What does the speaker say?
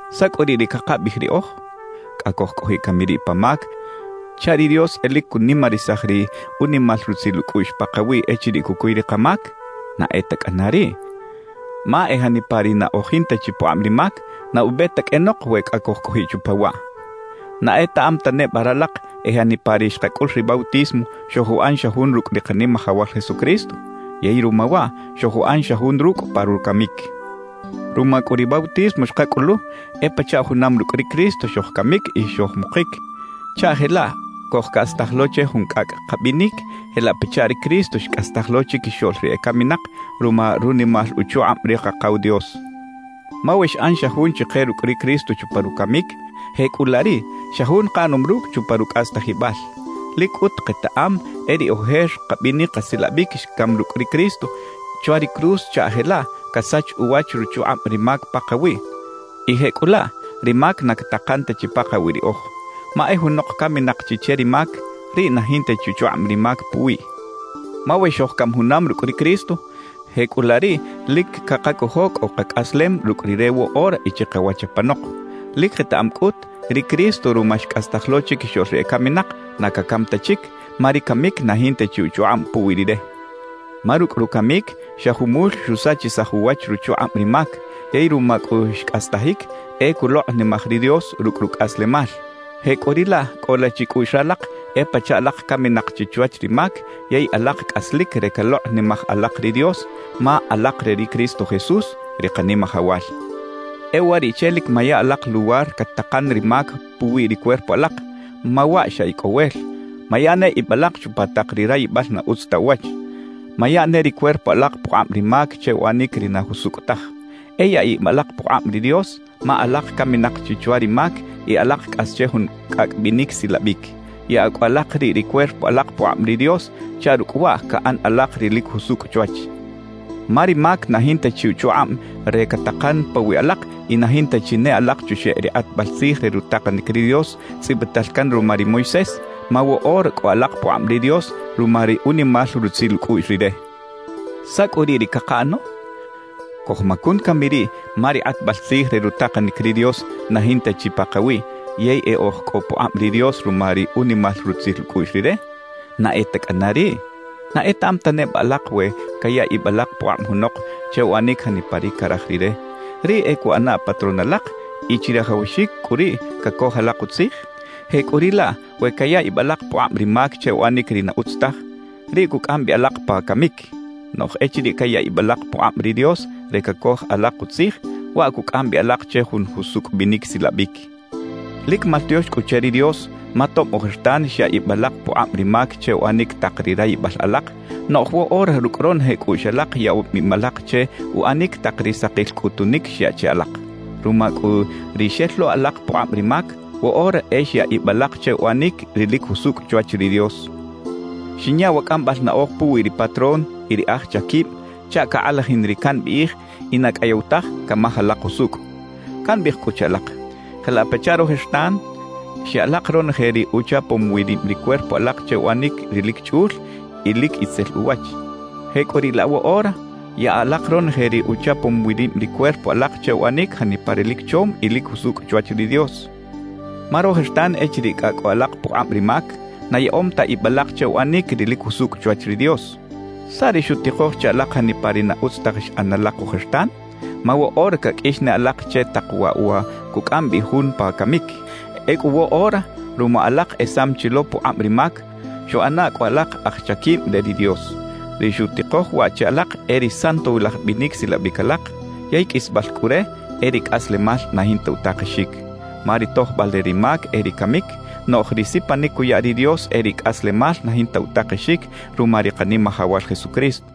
¿Saꞌ cꞌu riꞌ ri cakabiꞌij riꞌoj? ¿Cꞌa cojcꞌojiꞌ cami riꞌ pa mac chaꞌ ri Dios e lic cunimarisaj ri unimal rutzil ucꞌuꞌx pakawiꞌ echiriꞌ cucuy ri kamac? ¡Na e ta cꞌana riꞌ! Ma e janipa ri na oj jinta chi pukꞌab ri mac, na ube ta qꞌuenok we cꞌa cojcꞌojiꞌ chupa waꞌ. ¿Na etaꞌam ta neba ralak e janipa ri xkacꞌul ri bautismo, xojuꞌan xa jun rucꞌ ri Kanimajawal Jesucristo? Yey ruma waꞌ, xojuꞌan xa jun rucꞌ pa rucamic. Ruma cꞌu ri bautismo xkacꞌulu, e pachaꞌ junam rucꞌ ri Cristo xojcamic y xojmukic, chaꞌ jelaꞌ cojcꞌastaj lo che jun cꞌacꞌ kabinic jelaꞌ pachaꞌ ri Cristo xcꞌastaj lo chiquixoꞌl ri ecaminak ruma runimal uchukꞌab ri Kakaw Dios. Ma we xꞌan xa jun chike rucꞌ ri Cristo chupa rucamic, jecꞌulaꞌ riꞌ xa jun kaꞌanom rucꞌ chupa rucꞌastajibal. Lic cꞌut ketaꞌam e ri ojer kabinic kasilabic xcam rucꞌ ri Cristo chwa ri cruz chaꞌ jelaꞌ casach uwach ruchukꞌab ri mac pakawiꞌ y jecꞌulaꞌ ri mac na catakan ta chi pakawiꞌ riꞌoj. Ma e junok caminak chi che ri mac, riꞌ na jinta chi uchukꞌab ri mac puwiꞌ. Ma we xojcam junam rucꞌ ri Cristo, jecꞌulaꞌ riꞌ lic cakacojo cꞌo kacꞌaslem rucꞌ Rire woꞌora y chikawach apanok. Lic ketaꞌam cꞌut, ri Cristo ruma xcꞌastaj lo chiquixoꞌl ri ecaminak, na cacam ta chic, ma ri camic na jinta chi uchukꞌab puwi Rire. Ma rucꞌ rucamic xa jumul xusachisaj uwach ruchukꞌab ri mac; yey ruma cꞌu xcꞌastajic, e culokꞌnimaj ri Dios rucꞌ rucꞌaslemal. Jecꞌuriꞌlaꞌ cꞌola chicꞌuꞌx ralak e pachaꞌ alak caminak chi chwach ri mac yey alak cꞌaslic re calokꞌnimaj alak ri Dios, ma alak re ri Cristo Jesús, ri Kanimajawal. E uwariꞌche lic maya alak luwar catakan ri mac puwi ri cuerpo alak, ma waꞌ xa icꞌowel. Maya ne ib alak chupa tak ri rayibal na utz ta uwach. Maya ne ri cuerpo alak pukꞌab ri mac che uꞌanic ri na jusucꞌ taj. E yaꞌa ib alak pukꞌab ri Dios, ma alak caminak chi chwa ri mac y alak cꞌas che jun cꞌacꞌ binic silabic. Yaꞌa cꞌu alak riꞌ ri cuerpo alak pukꞌab ri Dios chaꞌ rucꞌ waꞌ caꞌan alak ri lic jusucꞌ chwach. Ma ri mac na jinta chi uchukꞌab re catakan pawiꞌ alak y na jinta chi ne alak chuxeꞌ ri kꞌatbal tzij re rutakanic ri Dios tzꞌibital can ruma ri Moisés, ma woꞌora cꞌo alak pukꞌab ri Dios ruma ri unimal rutzil ucꞌuꞌx Rire. ¿Saꞌ cꞌu riꞌ ri cakaꞌano? ¿Cojmacun cami riꞌ ma ri kꞌatbal tzij re rutakanic ri Dios na jinta chi pakawiꞌ yey e oj cꞌo pukꞌab ri Dios ruma ri unimal rutzil ucꞌuꞌx Rire? ¡Na e ta cꞌana riꞌ! ¿Na etaꞌam ta neba alak we caya ib alak pukꞌab junok che uꞌanic janipa ri caraj rire, riꞌ e cuꞌana patrón alak y chirajawaxic cꞌu riꞌ cacoj alak utzij? Jecꞌuriꞌlaꞌ we caya ib alak pukꞌab ri mac che uꞌanic ri na utz taj, riꞌ cucꞌam bi alak pa camic. Noꞌj echiriꞌ caya ib alak pukꞌab ri Dios re cacoj alak utzij, waꞌ cucꞌam bi alak che jun jusucꞌ binic silabic. Lic maltiox cꞌu che ri Dios, ma tob ojertan xyaꞌ ib alak pukꞌab ri mac che uꞌanic tak ri rayibal alak; noꞌj woꞌora rucꞌ ronoje cꞌuꞌx alak yaꞌom ib alak che uꞌanic tak ri sakil cꞌutunic xyaꞌ che alak. Ruma cꞌu ri xel lo alak pukꞌab ri mac, woꞌora e xyaꞌ ib alak che uꞌanic ri lic jusucꞌ chwach ri Dios. Xinya wa cꞌambal naꞌoj puwi ri patrón y ri aj chaquib chaꞌ cakꞌalajin ri cambiꞌij y na cꞌayew taj camaj alak usucꞌ. Cambiꞌij cꞌu che alak: Jelaꞌ pachaꞌ rojertan xya alak ronoje ri uchapom wi rib ri cuerpo alak che uꞌanic ri lic chꞌul y ri lic itzel uwach, jecꞌuriꞌlaꞌ woꞌora yaꞌa alak ronoje ri uchapom wi rib ri cuerpo alak che uꞌanic janipa ri lic chom y lic jusucꞌ chwach ri Dios. Ma rojertan echiriꞌ cꞌa cꞌo alak pukꞌab ri mac, na yaꞌom ta ib alak che uꞌanic ri lic jusucꞌ chwach ri Dios. ¿Saꞌ ri xutikoj che alak janipa ri na utz taj xꞌan alak ojertan? Ma woꞌora caqꞌuix ne alak che tak waꞌ wa cucꞌam bi jun pa camic. Ecꞌu woꞌora ruma alak esam chi lo pukꞌab ri mac, xuꞌana cꞌu alak aj chaquib re ri Dios. Ri xutikoj waꞌ che alak e ri santowilaj binic silabic alak; yey qꞌuisbal cꞌu re, e ri cꞌaslemal na jinta utakexic. Ma ri tojbal re ri mac e ri camic, noꞌj ri sipanic cuya ri Dios e ri cꞌaslemal na jinta utakexic ruma ri Kanimajawal Jesucristo.